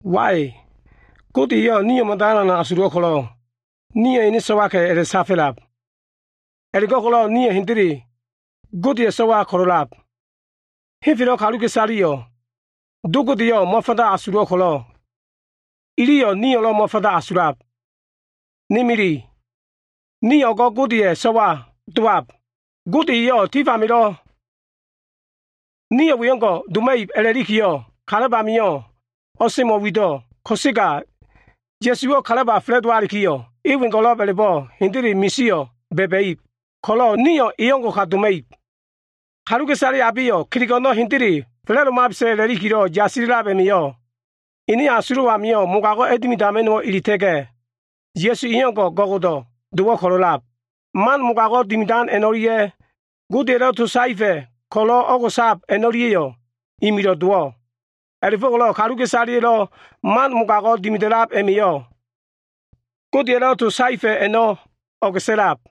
Wai! Gode eyo꞉ nio꞉ mada alan asulo꞉ ko꞉lo꞉ nio꞉ ene so꞉waka꞉ a꞉la꞉safo꞉lab. A꞉la꞉go꞉ko꞉lo꞉ nio꞉ hendele Godeya꞉ so꞉wa ko꞉lo꞉lab. Henfelo꞉ kaluka꞉isaleyo꞉ Do Godeyo꞉ mo꞉fanda asulo꞉ ko꞉lo꞉, iliyo꞉ nio꞉lo꞉ mo꞉fanda asulab. Ne mili, nio꞉ o꞉go꞉ Godeya꞉ so꞉wa dowab. Gode eyo꞉ tif amio꞉ nio꞉ we o꞉ngo꞉ doma꞉ib a꞉la꞉likiyo꞉, kalab amio꞉ o꞉semo꞉wido꞉. Ko꞉sega Ya꞉suwo꞉ kalaba fa꞉la꞉dowalikiyo꞉, e wengo꞉lo꞉b a꞉la꞉bo꞉ hendele misio꞉ ba꞉ba꞉ib ko꞉lo꞉, nio꞉ e o꞉ngo꞉ka doma꞉ib. Kaluka꞉isale abeyo꞉ kelego꞉ a꞉no꞉ hendele fa꞉la꞉domabesa꞉ a꞉la꞉likilo꞉ yasila꞉lab a꞉ma꞉yo꞉, ene asulo꞉ amio꞉ mogago꞉ a꞉dimidama꞉no꞉wo꞉ eleta꞉ga꞉, e Ya꞉su o꞉ngo꞉ go꞉go꞉do꞉ dowo꞉ ko꞉lo꞉lab. Mogago꞉ dimidan man o꞉lia꞉ Godeya꞉lo꞉ to saefa꞉ ko꞉lo꞉ o꞉go꞉sab man a꞉no꞉lia꞉yo꞉ imilo꞉ dowo꞉. A꞉la꞉fo꞉ko꞉lo꞉ kaluka꞉isaleya꞉lo꞉ man mogago꞉ dimida꞉lab a꞉ma꞉yo꞉, Godeya꞉lo꞉ to saefa꞉ a꞉no꞉ o꞉go꞉sa꞉lab.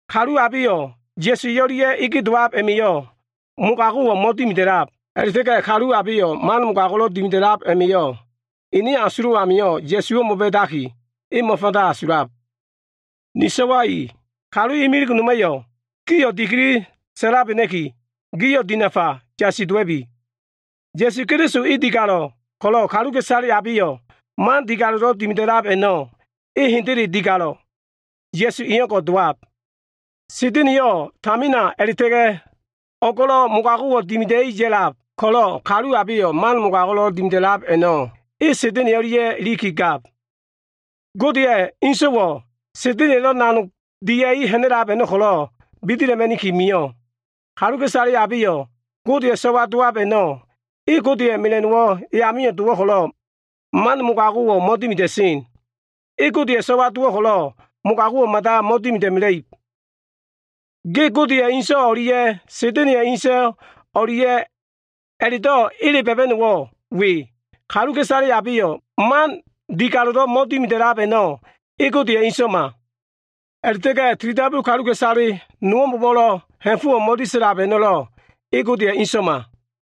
Kalu abeyo꞉ Ya꞉su e o꞉lia꞉lo꞉ dowab a꞉ma꞉yo꞉ mogago꞉wo꞉ mo꞉dimida꞉lab. A꞉la꞉ta꞉ga꞉ kalu abeyo꞉ man mogago꞉lo꞉ dimida꞉lab a꞉ma꞉yo꞉, ene asulo꞉ amio꞉ Ya꞉suwo꞉ mo꞉ba꞉daki, e mo꞉fanda asulab. Ni so꞉wa i, kalu imilig noma꞉yo꞉ gio꞉ dikili sa꞉labena꞉ki, gio꞉ dinafa yasi dowa꞉bi! Ya꞉su Keliso e digalo꞉ ko꞉lo꞉, kaluka꞉isale abeyo꞉ man digalo꞉lo꞉ dimida꞉lab a꞉no꞉, e hendele digalo꞉, Ya꞉su e o꞉ngo꞉ dowab. Sa꞉da꞉na꞉yo꞉ tamina a꞉la꞉ta꞉ga꞉ o꞉go꞉lo꞉, mogago꞉wo꞉ dimida꞉i ya꞉lab ko꞉lo꞉, kaluka꞉isale abeyo꞉ man mogago꞉lo꞉ dimida꞉lab a꞉no꞉, e Sa꞉da꞉na꞉ a꞉no꞉ ilikigab. Godeya꞉ ene So꞉wayo꞉ Sa꞉da꞉na꞉ya꞉lo꞉ nanogo꞉ dimida꞉i ha꞉na꞉lab a꞉no꞉ ko꞉lo꞉ bidila꞉ma꞉ni mio꞉. Kalu abeyo꞉ Godeya꞉ so꞉wa dowab a꞉no꞉, Godeya꞉ mela꞉no꞉wo꞉ eya dowo꞉ ko꞉lo꞉, man mogago꞉wo꞉ mo꞉dimida꞉sen. E Godeya꞉ so꞉wa ko꞉lo꞉, mogago꞉wo꞉ mada mo꞉dimida꞉mela꞉ib. Ge Godeya꞉ ene So꞉wa o꞉lia꞉ Sa꞉da꞉na꞉ya꞉ inso꞉ o꞉lia꞉ a꞉la꞉do꞉ ele ba꞉ba꞉no꞉wo꞉ we. Kaluka꞉isale abeyo꞉ man digalo꞉lo꞉ mo꞉dimida꞉lab a꞉no꞉, e Godeya꞉ so꞉wama. A꞉la꞉ta꞉ga꞉ tilidabu kaluka꞉isale nowo꞉mbo꞉wo꞉lo꞉ ha꞉fo꞉wo꞉ mo꞉disa꞉lab a꞉no꞉lo꞉, e Godeya꞉ so꞉wama.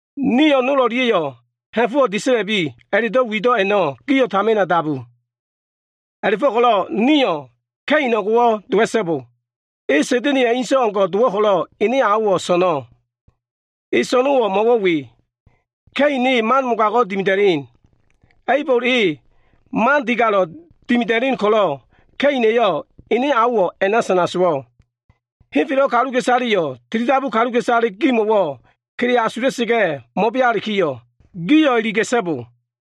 Nio꞉ nol o꞉lia꞉yo꞉ ha꞉fo꞉wo꞉ disa꞉la꞉lubi a꞉la꞉do꞉ wido꞉ a꞉no꞉ gio꞉ tamina dabu. A꞉la꞉fo꞉ko꞉lo꞉ nio꞉ Ka꞉in e o꞉ngo꞉wo꞉ dowa꞉so꞉bo. E mogago꞉lelo꞉ dimida꞉sen Sa꞉da꞉na꞉ya꞉ inso꞉ o꞉ngo꞉ ko꞉lo꞉ ene aowo꞉ so꞉no꞉. Elo꞉ so꞉no꞉wo꞉ mo꞉wo꞉ we. Ka꞉in e man mogago꞉ dimida꞉len. A꞉ibol e man digalo꞉ dimida꞉len ko꞉lo꞉, Ka꞉ina꞉yo꞉ ene aowo꞉ a꞉na sana sowo꞉. Henfelo꞉ kaluka꞉isaleya꞉yo꞉ tilidabu kaluka꞉isale gimo꞉wo꞉ kele asula꞉sa꞉ga꞉ mo꞉bealikiyo꞉, gio꞉ iliga꞉so꞉bo.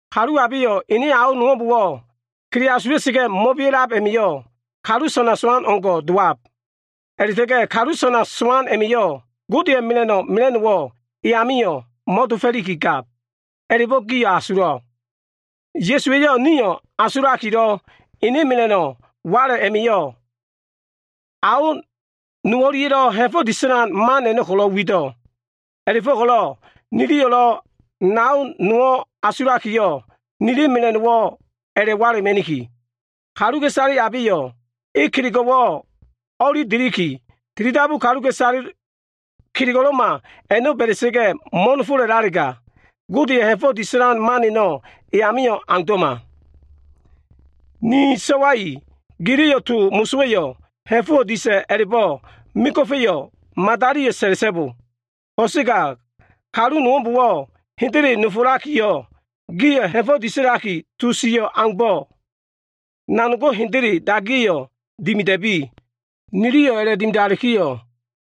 Kalu abeyo꞉ ene ao nowo꞉mbo꞉wo꞉ kele asulakilo꞉ mo꞉bea꞉lab a꞉ma꞉yo꞉, kalu sana sowano꞉ o꞉ngo꞉ dowab. A꞉la꞉ta꞉ga꞉ kalu sana sowan a꞉ma꞉yo꞉, Godeya꞉ mela꞉no꞉ mela꞉no꞉wo꞉ e amio꞉ mo꞉dofo꞉likigab, a꞉la꞉bo꞉ gio꞉ asulo꞉. Ya꞉suwa꞉yo꞉ ni asulakilo꞉, ene mela꞉no꞉ wala꞉ a꞉ma꞉yo꞉ ao nowo꞉lia꞉lo꞉ ha꞉fo꞉ disa꞉lan man a꞉no꞉ ko꞉lo꞉ wido꞉. A꞉la꞉fo꞉ko꞉lo꞉ niliyo꞉lo꞉ nao nowo꞉ asulakiyo꞉, nili mela꞉no꞉wo꞉lo꞉ a꞉la꞉wala꞉ma꞉niki. Kaluka꞉isale abeyo꞉ e kelego꞉wo꞉ o꞉li deliki, tilidabu kaluka꞉isale kelego꞉lo꞉ma a꞉no꞉ ba꞉da꞉sa꞉ga꞉ mo꞉nofolalega, Godeya꞉ ha꞉fo꞉ disa꞉lan man a꞉no꞉ e amio꞉ aundo꞉ma. Ni so꞉wa i, giliyo꞉ to mosowa꞉yo꞉ ha꞉fo꞉wo꞉ disa꞉ a꞉la꞉bo꞉ mego꞉fa꞉yo꞉ madaliyo꞉ sa꞉la꞉so꞉bo. Ko꞉sega kalu nowo꞉mbo꞉wo꞉ hendele nofolakiyo꞉, gio꞉ ha꞉fo꞉ disa꞉laki to sio꞉ aumbo꞉, nanogo꞉ hendele dagiya꞉yo꞉ dimida꞉bi. Niliyo꞉ a꞉la꞉dimidalikiyo꞉,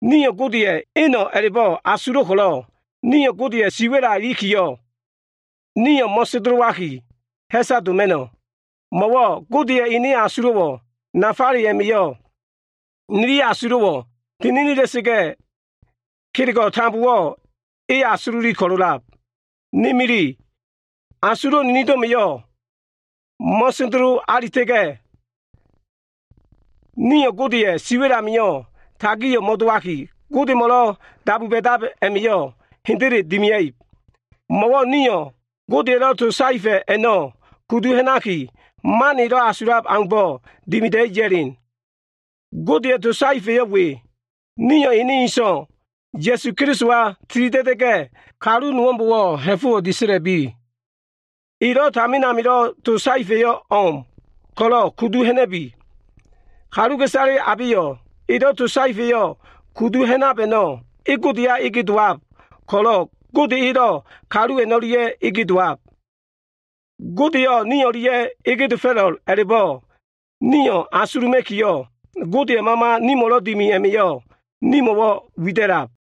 nio꞉ Godeya꞉ eno꞉ a꞉la꞉bo꞉ asulo꞉ ko꞉lo꞉, nio꞉ Godeya꞉ siwa꞉la ilikiyo꞉, nio꞉ mo꞉sendelowaki ha꞉saka doma꞉no꞉. Mo꞉wo꞉ Godeya꞉ ene asulo꞉ nafale a꞉ma꞉yo꞉ nili asulo꞉wo꞉ tininila꞉sa꞉ga꞉, kelego꞉ tambowo꞉ e asululi ko꞉lo꞉lab. Ne mili, asulo꞉ ninido꞉ma꞉yo꞉ mo꞉sendelo alitalega, nio꞉ Godeya꞉ siwa꞉l amio꞉ tagio꞉ mo꞉dowaki, Godemo꞉lo꞉ dabu ba꞉dab a꞉ma꞉yo꞉ hendele dimia꞉ib. Mo꞉wo꞉ nio꞉ Godeya꞉lo꞉ to saefa꞉ a꞉no꞉ kudu ha꞉naki, man elo꞉ asulab aumbo꞉ dimida꞉i ya꞉len. Godeya꞉ to saefa꞉yo꞉ we. Nio꞉ ene So꞉wa, Ya꞉su Kelisowa tilida꞉da꞉sa꞉ga꞉, kalu nowo꞉mbo꞉wo꞉ ha꞉fo꞉wo꞉ disa꞉la꞉bi. Elo꞉ tamin amilo꞉ to saefa꞉yo꞉ o꞉m ko꞉lo꞉ kudu ha꞉na꞉bi. Kaluka꞉isale abeyo꞉ elo꞉ to saefa꞉yo꞉ kudu ha꞉nab a꞉no꞉, e Godeya dowab ko꞉lo꞉ Gode elo꞉ kalu a꞉no꞉lia꞉yo꞉ dowab. Godeyo꞉ ni o꞉lia꞉ a꞉lab a꞉la꞉bo꞉ nio꞉ asuluma꞉ki, Godeya꞉ Mama nimo꞉lo꞉ dimi a꞉ma꞉yo꞉ nimo꞉wo꞉ wida꞉lab.